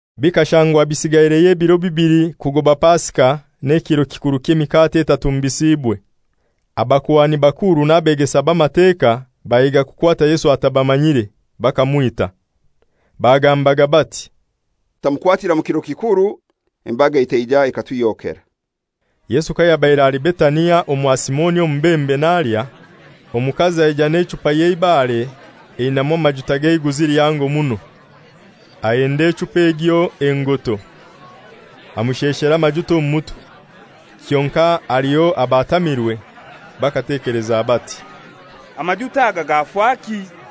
Bikashangwa bisigaireyo ebiro bibili kugoba Pasika n'ekiro kikuru ky'emikate etatumbisiibwe. Abakuhani bakuru n'abegesa b'Amateka bahiga kukwata Yesu atabamanyire, bakamwita. Bagambaga bati, «Tutamukwatira mu kiro kikuru, embaga etaija ekatuhyokera.» Yesu kayabaire ali Betania omwa Simoni omubembe nalya, omukazi aija n'echupa y'eibare einamu amajuta g'eiguzi lihango muno, ahenda echupa egyo engoto, amusheshera amajuta omu mutwe. Kyonkai haliho abatamirwe bakatekeleza bati, «Amajuta aga gafaki?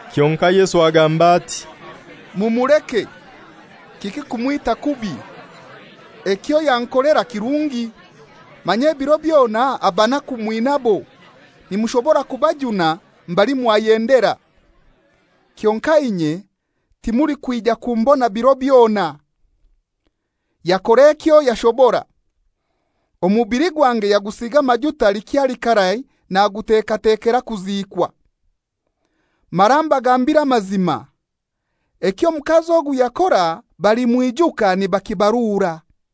Kyonkai Yesu agamba ati, «Mumuleke; kiki kumwita kubi? Ekyo yankolera kirungi. Manya ebiro byona abanaku mwinabo; nimushobora kubajuna mbali mwayendera. Kyonkai inye timulikwija kumbona biro byona. Yakora ekyo yashobora. Omubili gwange yagusiiga amajuta likyali karai nagutekatekera kuziikwa. Mara mbagambiire amazima, eky'omukazi ogu yakora balimwijuka nibakibarura.»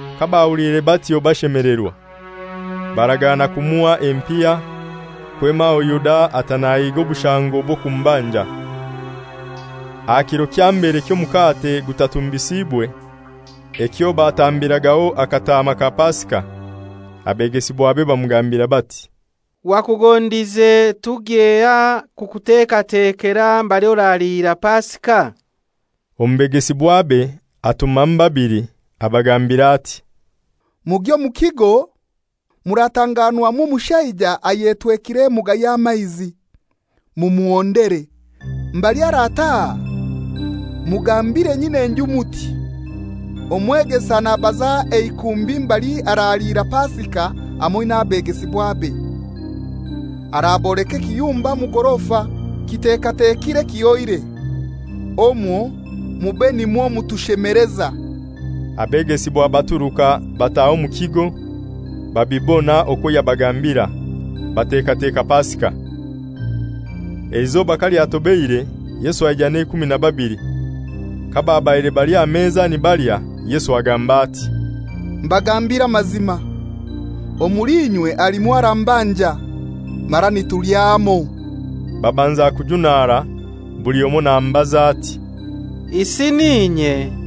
Kabahuliire batyo bashemelerwa, baragana kumuha empiha. Kwema aho Yuda ata nahiga obushango bw'okumubanja. Aha kiro kya mbere ky'Omukate Gutatumbisiibwe, ekyo batambiragaho akataama ka Pasika, abegesibwabe bamugambira bati, «Wakugondize tugyehai kukutekatekera mbali oraliira Pasika?» Omu begesibwabe atumamu babili, abagambira ati, «Mugye omu kigo, muratanganwamu omushaija ayetwekire emuga y'amaizi. Mumuhondere, mbali arataha, mugambire nyin'enju muti, ‹Omwegesa nabaza eikumbi mbali araliira Pasika hamoi n'abegesibwabe.› Araboleka ekiyumba omu gorofa, kitekatekire kihoire; omwo mube nimwo mutushemeleza.» Abegesibwa baturuka bataha omu kigo, babibona okwo yabagambira, batekateka Pasika. Eizoba kalyatobeire Yesu aija n'eikumi na babili. Kababaire bali aha meza nibalya, Yesu agamba ati, «Mbagambiire amazima, omuli inywe halimu arambanja, mara nitulya hamoi.» Babanza kujunara buli omoi namubaza ati, «Isi n'inye?»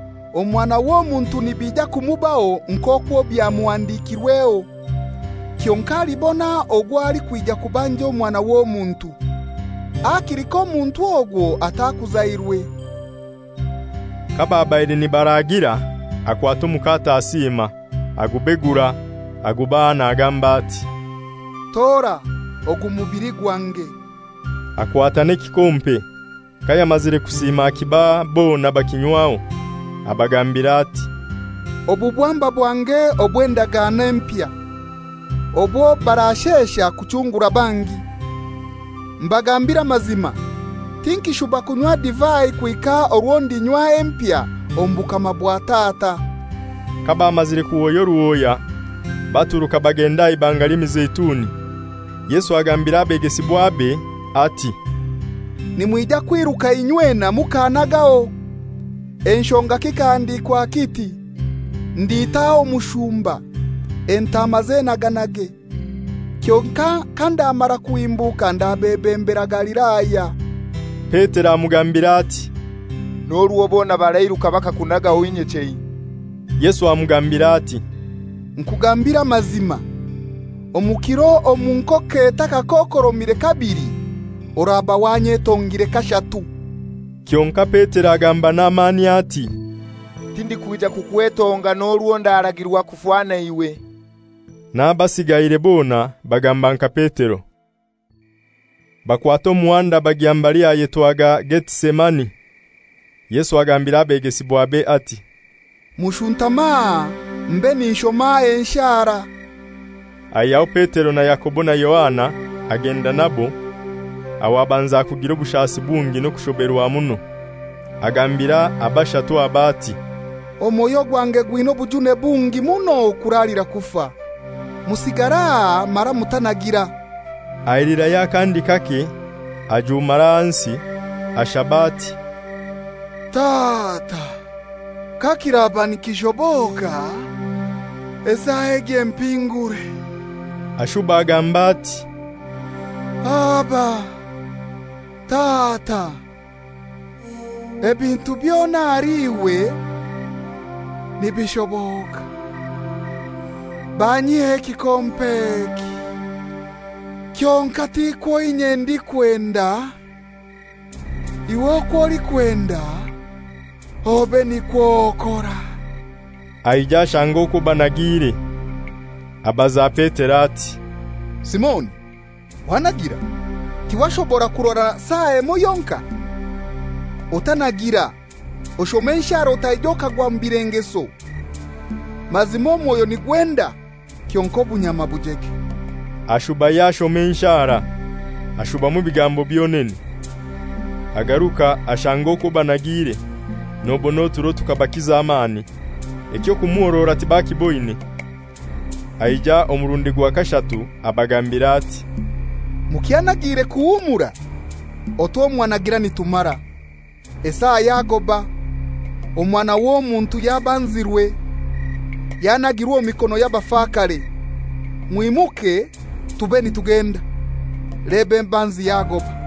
Omwana w'Omuntu nibija kumubaho nk'okwo bywamuhandikirweho, kyonkai alibona ogwo alikwija kubanja Omwana w'Omuntu! Hakili k'omuntu ogwo atakuzairwe.» Kababaire nibalya, akwata omukate, asiima, agubegura, agubaha nagamba ati, «Tora, ogu mubili gwange.» Akwata n'ekikompe, kayamazire kusiima akibaha, bona bakinywaho. Abagambira ati, «Obu bwamba bwange obw'endagano empya, obwo barashesha kuchungura bangi. Mbagambiire amazima, tinkishuba kunywa divai kuhika orwo ndinywa empya omu bukama bwa Tata.» Kabamazire kuhoya oruhoya, baturuka bagenda aha Ibanga ly'Emizeituni. Yesu agambira abegesibwabe ati, «Nimwija kwiruka inywena mukannagaho. Enshonga kikahandikwa kiti, ‹Ndiita omushumba, entaama zenaganage.› Kyonkai kandamara kuhimbuka ndabebembera Galilaya.» Petero amugambira ati, «N'orwo bona barairuka bakakunagaho, inye chei!» Yesu amugambira ati, «Nkugambire amazima, omu kiro omu enkoko etakakokoromire kabili, oraba wanyetongire kashatu.» Kyonkai Petero agamba n'amani ati, «Tindikwija kukwetonga, n'orwo ndaragirwa kufa naiwe.» N'abasiigaire bona bagamba nka Petero. Bakwata omuhanda bagya mbali hayetwaga Getisameni. Yesu agambira abegesibwabe ati, «Mushuntame aha mbe ninshoma enshara.» Aihyaho Petero na Yakobo na Yohana agenda nabo, aho abanza kugira obushasi bungi n'okushoberwa muno. Agambira abashatu aba ati, «Omwoyo gwange gwina obujune bungi muno kuralira kufa. Musigare aha mara mutanagira.» Ailirayo akandi kake, ajumara ahansi, ashaba ati, «Tata, kakiraba nikishoboka esaa egi empingure.» Ashuba agamba ati, «Aba. Tata, ebintu byona ahali iwe nibishoboka. Banyihyeho ekikompe eki. Kyonkai tikwo inye ndikwenda, iwe okwo olikwenda obe nikwo okora.» Aija ashanga okwo banagiire, abaza Petero ati, «Simoni, wanagira? Tiwashobora kurora saa emoi yonkai? Otanagira, oshome enshara otaija okagwa omu bilengeso. Mazima omwoyo nigwenda, kyonkai obunyama bujege.» Ashubayo ashoma enshara, ashubamu ebigambo byonene. Agaruka ashanga okwo banagiire, nobona oturo tukabakiza amani. Eky'okumuhorora tibakiiboine. Aija omurundi gwa kashatu abagambira ati, «Mukyanagiire kuhumura? Otwo mwanagira nitumara; esaa yagoba, Omwana w'Omuntu yabanzirwe, yanagirwe omu mikono y'abafakare. Mwimuke tube nitugenda, leba embanzi yagoba.»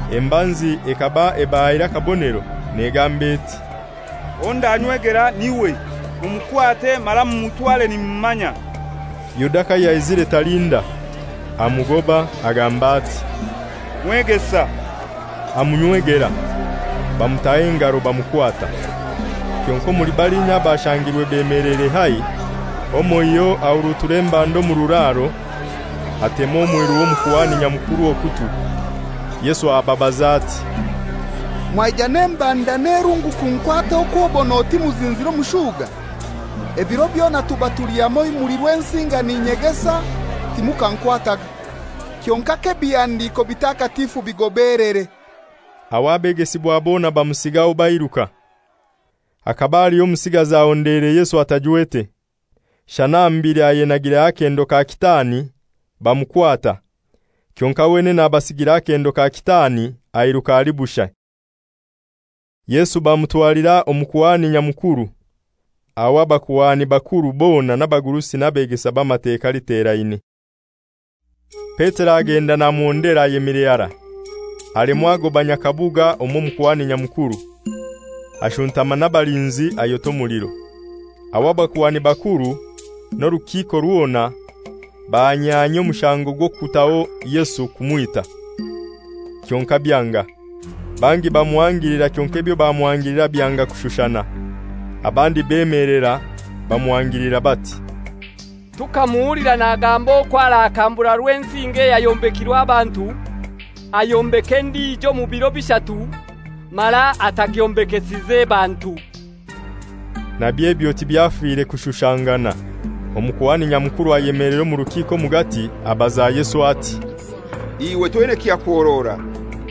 Embanzi ekaba ebahaire akabonero negamba eti, «Owo ndanywegera n'iwe; mumukwate mara mumutware nimumanya.» Yuda kayaizire talinda, amugoba, agamba ati, «Mwegesa!» Amunywegera. Bamutaho engaro bamukwata. Kyonkai omuli balinya abashangirwe bemeleire haihi, omoiho ahurutura embanda omu kiraro, atema omwiru w'Omukuhani Nyamukuru okutwi. Yesu ababaza ati, «Mwaija n'embanda n'erungu kunkwata okwobon'oti muzinzire omushuga? Ebiro byona tuba tuli hamoi Rwensinga n'inyegesa, timukankwataga. Kyonkai k'ebihandiko bitakatifu bigobelere.» Aho abegesibwa bona bamusigaho bairuka. Hakaba haliho omusigazi ahondeire Yesu atajwete, shana aha mubili ayenagireho akendo ka kitaani; bamukwata. Kyonkai wenene abasigira akendo ka kitaani airuka ali bushai. Yesu bamutwalira Omukuhani Nyamukuru; aho abakuhani bakuru bona n'abagurusi n'abegesa b'Amateka literaine. Petero agenda namuhondera ayemire harai, alemwa agoba nyakabuga omw'Omukuhani Nyamukuru. Ashuntama n'abalinzi, ayota omuliro. Aho abakuhani bakuru n'orukiiko rwona bahanyanyia omushango gw'okutaho Yesu kumwita, kyonkai byanga. Bangi bamuhangilira kyonkai ebyo bamuhangilira byanga kushushana. Abandi bemelera bamuhangilira bati, «Tukamuhulira nagamba okwo arakambura Rwensinga eyayombekirwe abantu, ayombeke endijo omu biro bishatu, mara atagyombekesize bantu.» Nabyo ebyo tibyafire kushushangana. Omukuhani Nyamukuru ayemelera omu rukiiko omugati, abaza Yesu ati, «Iwe toina kyakuhorora?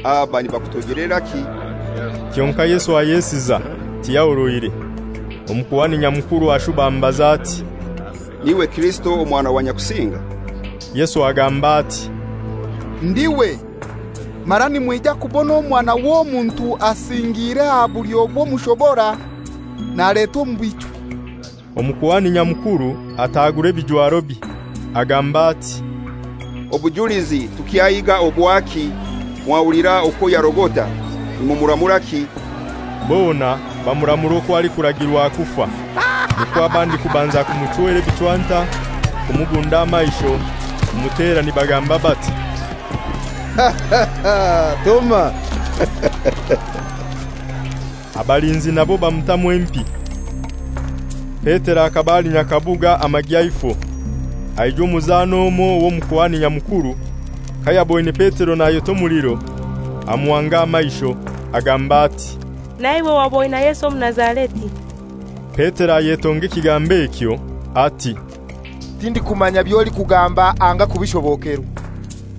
Aba nibakutoijeleraki?» Kyonkai Yesu ayesiza, tiyahoroire. Omukuhani Nyamukuru ashuba amubaza ati, «N'iwe Kirisito Omwana wa Nyakusinga?» Yesu agamba ati, «Ndiwe, mara nimwija kubona Omwana w'Omuntu asingiire aha bulyo bw'Omushobora, naletwa omu bichwi.» Omukuhani Nyamukuru atagura ebijwarobye, agamba ati, «Obujulizi tukyahiiga obwaki? Mwahulira okwo yarogota. Nimuramuraki?» Bona bamuramura okwo alikuragirwa. Nikwo abandi kubanza kumuchwera ebichwanta, kumubunda amaisho, kumutera, nibagamba bati, «Toma!» Abalinzi nabo bamutamu empi. Petero akaba ali nyakabuga amagyaifo, aijwa omuzana omoi w'Omukuhani Nyamukuru. Kayaboine Petero nayota omuliro, amuhanga amaisho, agamba ati, «Naiwe waba oina Yesu Omunazareti.» Petero ayetonga ekigambo ekyo ati, «Tindikumanya by'olikugamba anga kubishobokerwa!»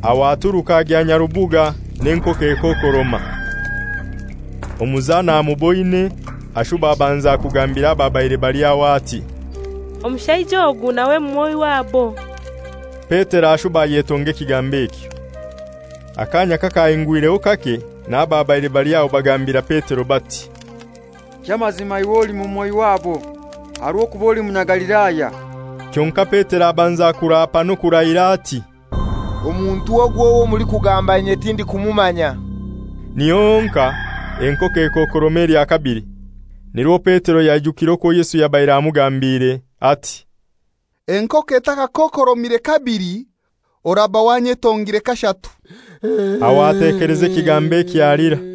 Aho aturuka agya nyarubuga n'enkoko ekokoroma. Omuzana amuboine, ashuba abanza kugambira ababaire bali aho ati, «Omushaija ogu nawe mumoi wabo.» Petero ashuba ayetonga ekigambo ekyo. Akaanya kakahingwireho kake n'ababaire bali aho bagambira Petero bati, «Ky'amazima iwe oli mumoi wabo; aha rw'okuba oli Munyagalilaya.» Kyonkai Petero abanza kuraapa n'okurahira ati, «Omuntu ogu owo mulikugamba inye tindikumumanya.» Niho honkai ekoko ekokoroma elya kabili. Nirwo Petero yaijukire okwo Yesu yabaire amugambiire ati, «Enkoko etakakokoromire kabili oraba wanyetongire kashatu.» Aho atekeleza ekigambo ekyo, alira.